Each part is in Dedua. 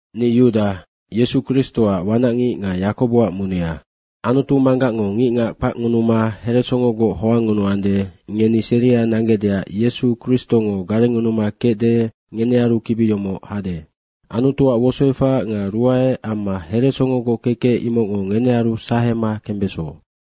Ni Yuda, Yesu Kristoac wanacngic nga Yakoboac munea. Anutu Manggacngo ngicngac kpacngunuma heresongogoc hoangngunuande, ngeni seria nanggecdeac Yesu Kristongo garengngunuma kecde, ngenearu kibi yomoc hade. Anutuac wosoefac nga ruae amma heresongogoc kekec imocngo ngenearu sahema kembeso.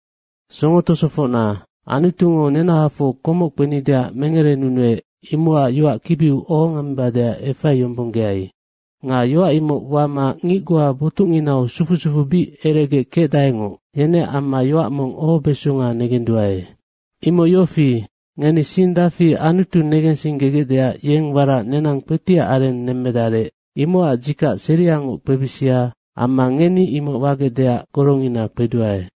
Songo tosofocna, Anutungo nenahafoc komoc kpenideac mengerenunuec, imocac yoac kibiu ohongemmebadeac efaiyombonggeai. Nga yoac imoc wama ngic goa botucnginau sufu sufuu bic eregec kecdaengoc, yeneac amma yoac mong ohobeso negenduae. Imoc yofi, ngeni sing dafi Anutu negensinggegecdeac yeng warac nenang kpetiac areng nemmedarec, imocac dzikac seriangoc kpebisia amma ngeni imoc mi wagecdeac gorongina kpeduae.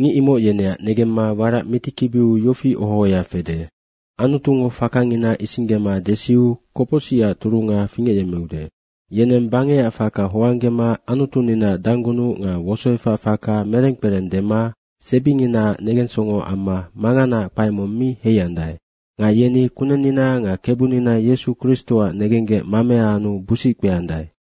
Ngic imoc yeneac negemma warac mitikibiu yofi oho ohoya fede, “Anutungo fakangina isinggema desiu kopocsicac turunga fingecyemmeude.” Yeneng bangecac faka hoanggema Anutuninaac danggunuc nga wosoefac faka mereng kpereng dema sebinginaac negensongo amma manganaac kpae mong mi heiandae. Nga yeni Kunennina nga Kebunina Yesu Kristoac negenggec mamea anu busic kpeandae.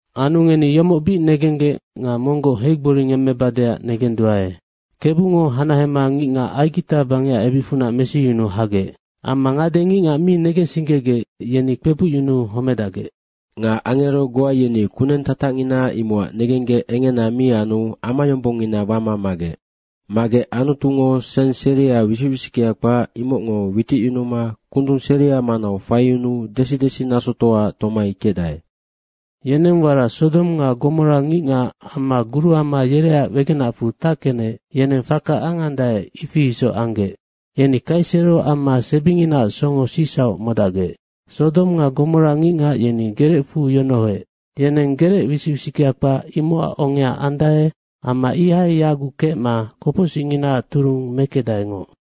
Anu ngeni yomoc bic negenggec nga monggoc heigboringemmebadeac negenduae. Kebungo hanahema ngicngacfora Aigita bangecac ebicfunac mesiyunuu hagec amma ngade ngicngac mi negensinggegec, yeni kpebucyunuu homedacgec. Nga angero goa yeni kuneng tatacngina imocac negenggec engena mi anu amayombongngina wama magec. Magec Anutungo seng seria wisic wisickea kpac, imocngo witicyunuma kundung seria manau faiyunuu desi desi nasotoaac tomai kecdae. Yeneng warac Sodong nga Gomora ngicngac amma guruama yereac wegenacfu tackenec, yeneng faka angandae, ifi isoc anggec. Yeni kaisero amma sebinginaac songo sicsauc modacgec. Sodong nga Gomora ngicngac, yeni gerecfu yonohoec, yeneng gerec wisic wisickea kpac imocac ongea andae amma ihai yaguc kecma kopocsicnginaac turung mekecdaengoc.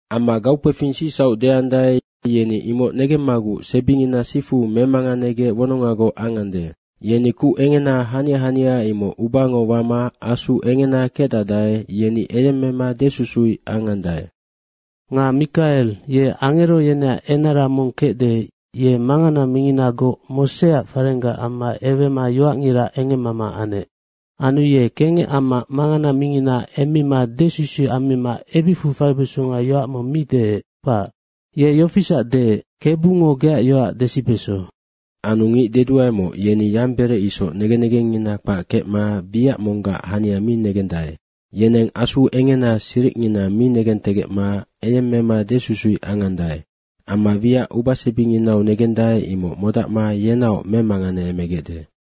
Amma gaukpefing sicsauc deandae, yeni imoc negemmaguc sebingina sifu memanganegec wonongagoc angande. Yeni kuc engena hania hania, imoc ubango wama asu engena kecdacdae, yeni eyemmema desusuic angande. Nga Mikae ye angero yeneac enara mong kecde, yeng mangana minginagoc Moseac farenggac amma ewema yoacngira engemmama anec. Anu ye kengec amma mangana mingina emmima desusuic ammima ebicfu faibesonga yoac mong mi deec, kpac. Ye yofisac deec, “Kebungo geac yoac desibeso.” Anu ngic deduaemoc, yeni yamberec isoc negen negengngina kpac kecma wiac monggac hania mi negendae. Yeneng asu engena siricngina mi negentegecma eyemmema desusuic angandae. Amma wiac ubasebinginau negendae, imoc modacma yenaoc memanganeemegecde.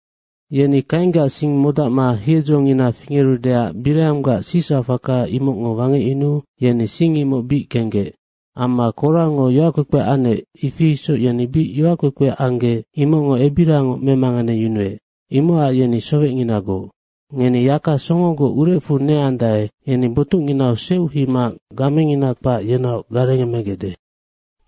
Yeni Kainggac sing modacma hiedzongina fingerudeac Bireanggac sicsauc faka imocngo wangecyunuu yeni sing imoc bic kenggec. Amma Korango yoackpekpe anec, ifi isoc yeni bic yoackpekpe anggec, imocngo ebiriangoc memanganeyunuec. Imocac yeni sowecnginagoc. Ngeni yaka songogoc urecfu neandae, yeni botucnginau seuc heima gamengina kpac, yenaoc garengemegecde.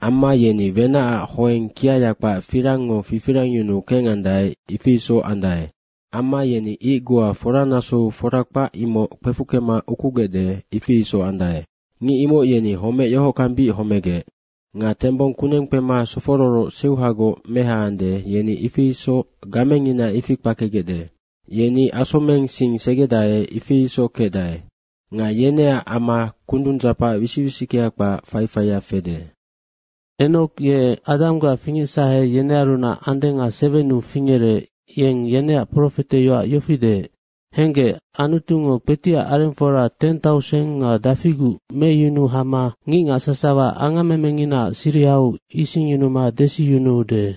Amma yeni wenacac hoeng kiaya kpac firangngo fifirangyunu kengandae, ifi isoc andae. Amma yeni ic goa foranasou fora kpac imoc kpefuckema ukugecde, ifi isoc andae. Ngic imoc yeni homec yohockang bic homegec. Nga tembong kuneng kpema sofororoc seuhagoc mehaande, yeni ifi isoc gamengina ifi kpakegecde. Yeni asomeng sing segedae, ifi isoc kecdae. Nga yeneac ama kundung dzapac wisic wisickea kpac faifaia fede. Anu Enoko ye Adanggac fingecsahe yenearunac andenga sewennu fingerec, yeng yeneac profeteyoac yofi deec, “Henggec, Anutungo kpetiac arengfora teng tauseng nga dafiguc meyunuu hama ngicngac sasawa angammenginaac sirihau isingyunuma desiyunuude.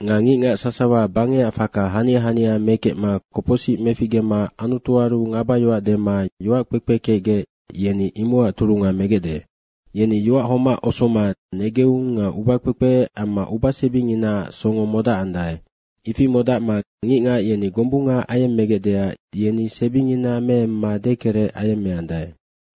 Nga ngicngac sasawa bangecac faka hania hania mekecma kopocsic meficgema Anutuaru ngabayoac dema yoac kpekpe kecgec, yeni imocac turunga megecde.” Yeni yoac homac osoma negeung nga ubakpekpe amma ubasebinginaac songo modacandae. Ifi modacma ngicngac yeni gombunga ayemmegecdeac, yeni sebingina meemma dekerec ayemmeandae.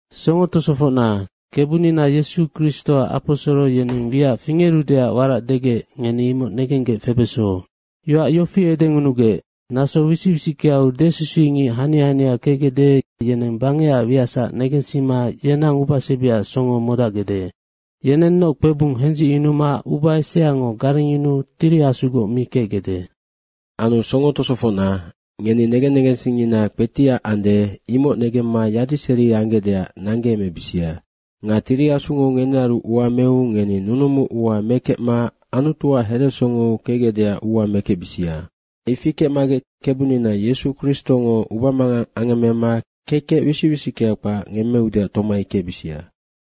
Songo tosofocna, Kebunina Yesu Kristoac aposoro yeneng wiac fingerudeac warac degec, ngeni imoc negenggec febeso. Yoac yofi edengunugec, “Naso wisic wisickeau desusuicngic hania hania kecgecde, yeneng bangecac wiacsac negensima yenang ubasebiac songo modacgecde.” Yenennoc kpebung hendzicyunuma uba eseango garengyunuu Tiri Asugoc mi kecgecde. Anu songo tosofocna, ngeni negen negensingngina kpetiac ande, imoc negemma yadiseri anggecdeac nanggeemebisia. Nga Tiri Asungo ngenearu ua meu ngeni nunumu ua mekecma Anutuac heresongou kecgecdeac ua mekecbisia. Nga ifi kecmagec Kebunina Yesu Kristongo ubamangang angemmema kekec wisic wisickea kpac ngemmeudeac tomai kecbisia.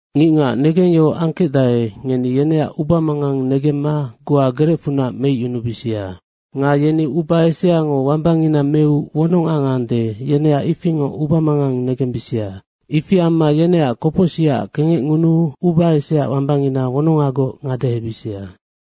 Ngicngac negengyohoc angkecdae, ngeni yeneac ubamangang negemma goa gerecfunac meicyunubisia. Nga yeni uba eseango wambangina meu wonong angande, yeneac ifingoc ubamangang negembisia. Ifi amma yeneac kopocsicac kengecngunuu uba eseaac wambangina wonongagoc ngadehebisia.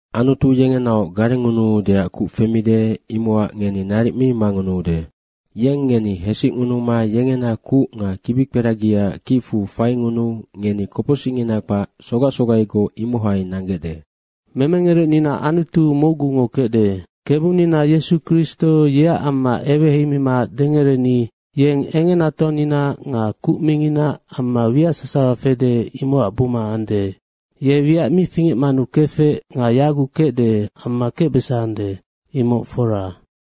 Anutu yengenaoc garengngunuudeac kuc femide, imocac ngeni naric mi mangunuude. Yeng ngeni hesicngunuma yengena kuc nga kibikperagiaac kicfu faingunuu ngeni kopocsicngina kpac sufu sufugoc imohai nanggecde. Memengerecnina Anutu mocgungo kecde. Kebunina Yesu Kristo yeac amma eweheimima dengereni, yeng engenatoanina nga kuc mingina amma wiac sasawa fede, imocac buma ande. Ye wiac mi fingecmanu kefec nga yaguc kecde amma kecbesande, imoc fora.